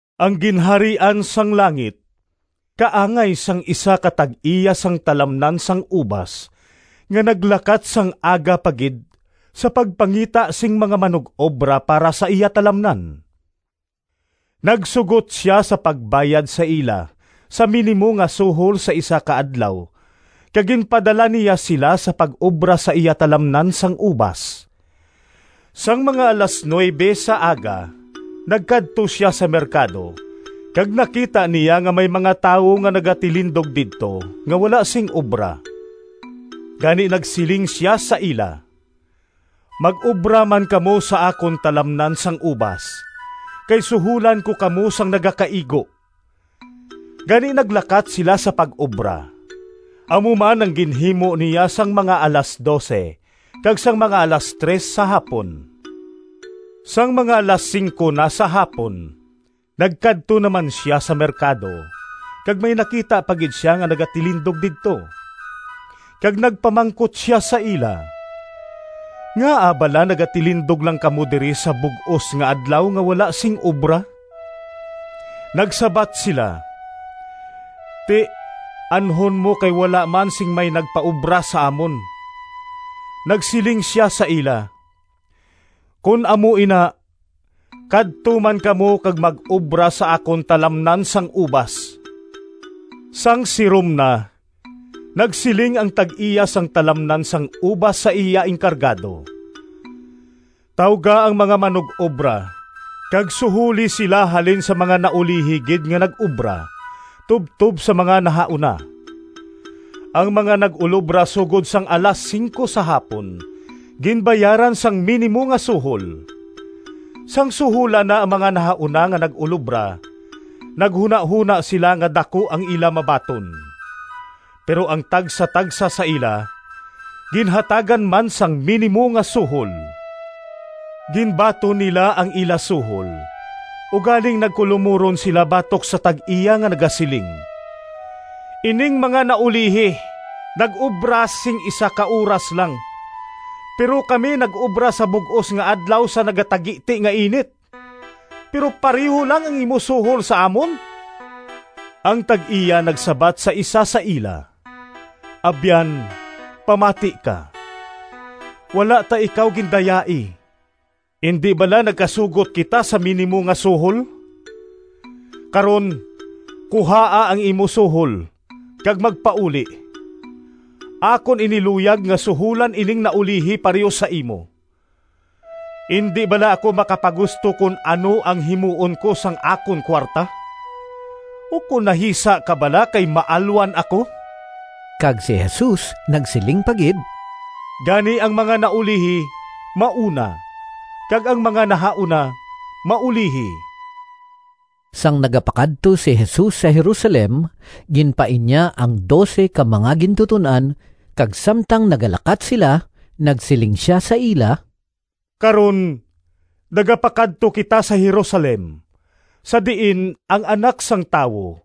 “Ang Ginharian sang langit kaangay sang isa ka tag-iya sang talamnan sang ubas nga naglakat sang aga pa gid sa pagpangita sing mga manug-obra para sa iya talamnan. Nagsugot sia sa pagbayad sa ila sa minimo nga suhol sa isa ka adlaw kag ginpadala niya sila sa pag-obra sa iya talamnan sang ubas. Sang mga alas nuwebe sa aga nagkadto sia sa merkado kag nakita niya nga may mga tawo nga nagatilindog didto nga wala sing obra. Gani nagsiling sia sa ila, ‘Mag-obra man kamo sa akon talamnan sang ubas, kay suholan ko kamo sang nagakaigo.’ Gani naglakat sila sa pag-obra. Amo man ang ginhimo niya sang mga alas dose kag sang mga alas tres sa hapon. Sang mga alas singko na sa hapon nagkadto naman sia sa merkado kag may nakita pa gid sia nga nagatilindog didto, kag nagpamangkot sia sa ila, ‘Ngaa bala nagatilindog lang kamo diri sa bug-os nga adlaw nga wala sing obra?’ Nagsabat sila, ‘Ti, anhon mo kay wala man sing may nagpaobra sa amon.’ Nagsiling sia sa ila, ‘Kon amo ina, kadto man kamo kag mag-obra sa akon talamnan sang ubas.’ “Sang sirom na, nagsiling ang tag-iya sang talamnan sang ubas sa iya enkargado, ‘Tawga ang mga manug-obra kag suholi sila halin sa mga naulihi gid nga nag-obra tubtob sa mga nahauna.’ Ang mga nag-ulobra sugod sang alas singko sa hapon ginbayaran sang minimo nga suhol. Sang suholan na ang mga nahauna nga nag-ulobra, naghunahona sila nga daku ang ila mabaton, pero ang tagsatagsa sa ila ginhatagan man sang minimo nga suhol. Ginbaton nila ang ila suhol, ugaling nagkulomuron sila batok sa tag-iya, nga nagasiling, ‘Ining mga naulihi nag-obra sing isa ka oras lang, pero kami nag-obra sa bug-os nga adlaw sa nagatagiti nga init, pero pareho lang ang imo suhol sa amon!’ Ang tag-iya nagsabat sa isa sa ila, ‘Abyan, pamati ka! Wala ta ikaw gindayai. Indi bala nagkasugot kita sa minimo nga suhol? Karon, kuhaa ang imo suhol, kag magpauli. Akon ini luyag nga suholan ining naulihi pareho sa imo. Indi bala ako makapagusto kon ano ang himuon ko sang akon kuwarta? Ukon nahisa ka bala kay maalwan ako?’” Kag si Jesus nagsiling pa gid, “Gani ang mga naulihi mauna, kag ang mga nahauna maulihi.” Sang nagapakadto si Jesus sa Jerusalem, ginpain niya ang dose ka mga gintuton-an kag samtang nagalakat sila nagsiling sia sa ila, “Karon, nagapakadto kita sa Jerusalem sa diin ang Anak sang Tawo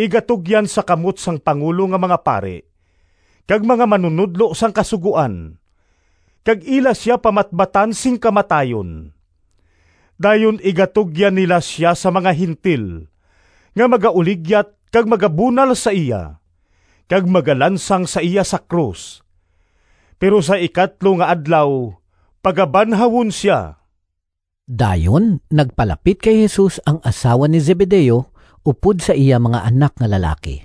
igatugyan sa kamot sang pangulo nga mga pari kag mga manunodlo sang Kasugoan, kag ila sia pamatbatan sing kamatayon. Dayon igatugyan nila sia sa mga Gentil nga magauligyat kag magabunal sa iya, kag magalansang sa iya sa krus, pero sa ikatlo nga adlaw pagabanhawon sia.” Dayon nagpalapit kay Jesus ang asawa ni Zebedeo upod sa iya mga anak nga lalaki,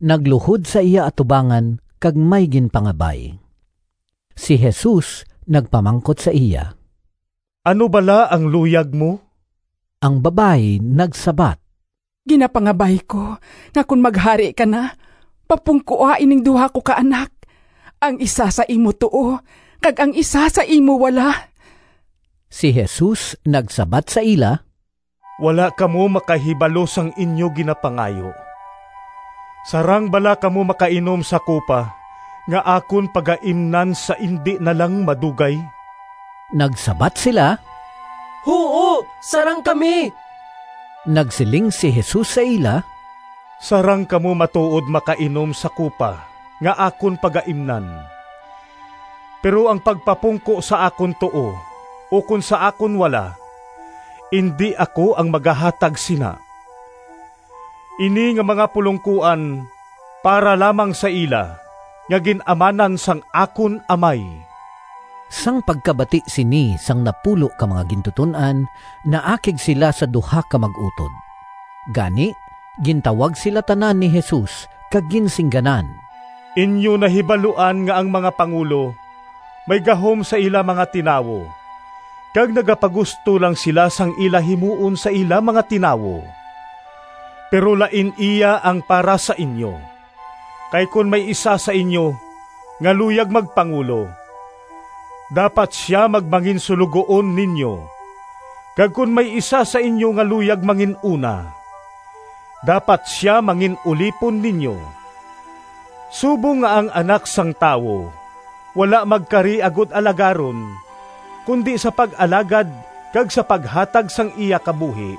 nagluhod sa iya atubangan, kag may ginpangabay. Si Jesus nagpamangkot sa iya, “Ano bala ang luyag mo?” Ang babayi nagsabat, “Ginapangabay ko nga kon maghari ka na, papungkoa ining duha ko ka anak, ang isa sa imo tuo kag ang isa sa imo wala.” Si Jesus nagsabat sa ila, “Wala kamo makahibalo sang inyo ginapangayo. Sarang bala kamo makainom sa kupa nga akon pagaimnan sa indi na lang madugay?” Nagsabat sila, “Huo, sarang kami.” Nagsiling si Jesus sa ila, “Sarang kamo matuod makainom sa kupa nga akon pagaimnan. Pero ang pagpapungko sa akon tuo ukon sa akon wala, indi ako ang magahatag sina. Ini nga mga pulongkoan para lamang sa ila nga gin-amanan sang akon Amay.” Sang pagkabati sini sang napulo ka mga gintuton-an naakig sila sa duha ka mag-utod. Gani gintawag sila tanan ni Jesus kag ginsingganan, “Inyo nahibaluan nga ang mga pangulo may gahom sa ila mga tinawo kag nagapagusto lang sila sang ila himuon sa ila mga tinawo. Pero lain iya ang para sa inyo. Kay kon may isa sa inyo nga luyag magpangulo, dapat sia magmanginsuloguon ninyo. Kag kon may isa sa inyo nga luyag mangin-una, dapat sia mangin-ulipon ninyo. Subong nga ang Anak sang Tawo wala magkari agod alagaron, kundi sa pag-alagad kag sa paghatag sang iya kabuhi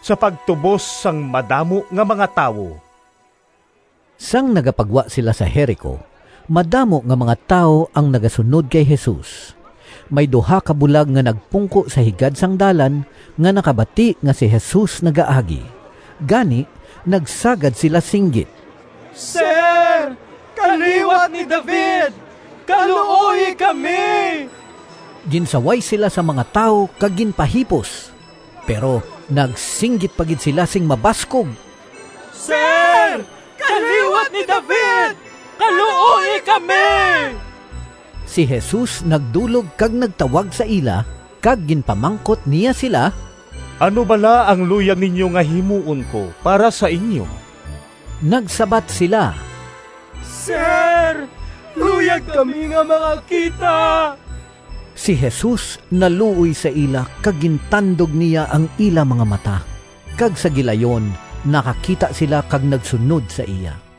sa pagtubos sang madamo nga mga tawo.” Sang nagapagwa sila sa Jerico, madamo nga mga tawo ang nagasunod kay Jesus. May duha ka bulag nga nagpungko sa higad sang dalan nga nakabati nga si Jesus nagaagi, gani nagsagad sila singgit, “Sir, kaliwat ni David! Kaluoyi kami!” Ginsaway sila sang mga tawo kag ginpahipos. Pero nagsinggit pa gid sila sing mabaskog, “Sir, kaliwat ni David! Kaluoyi kami!” Si Jesus nagdulog kag nagtawag sa ila, kag ginpamangkot niya sila, “Ano bala ang luyag ninyo nga himuon ko para sa inyo?” Nagsabat sila, “Sir, luyag kami nga makakita!” Si Jesus naluoy sa ila kag gintandog niya ang ila mga mata, kag sa gilayon nakakita sila kag nagsunod sa iya.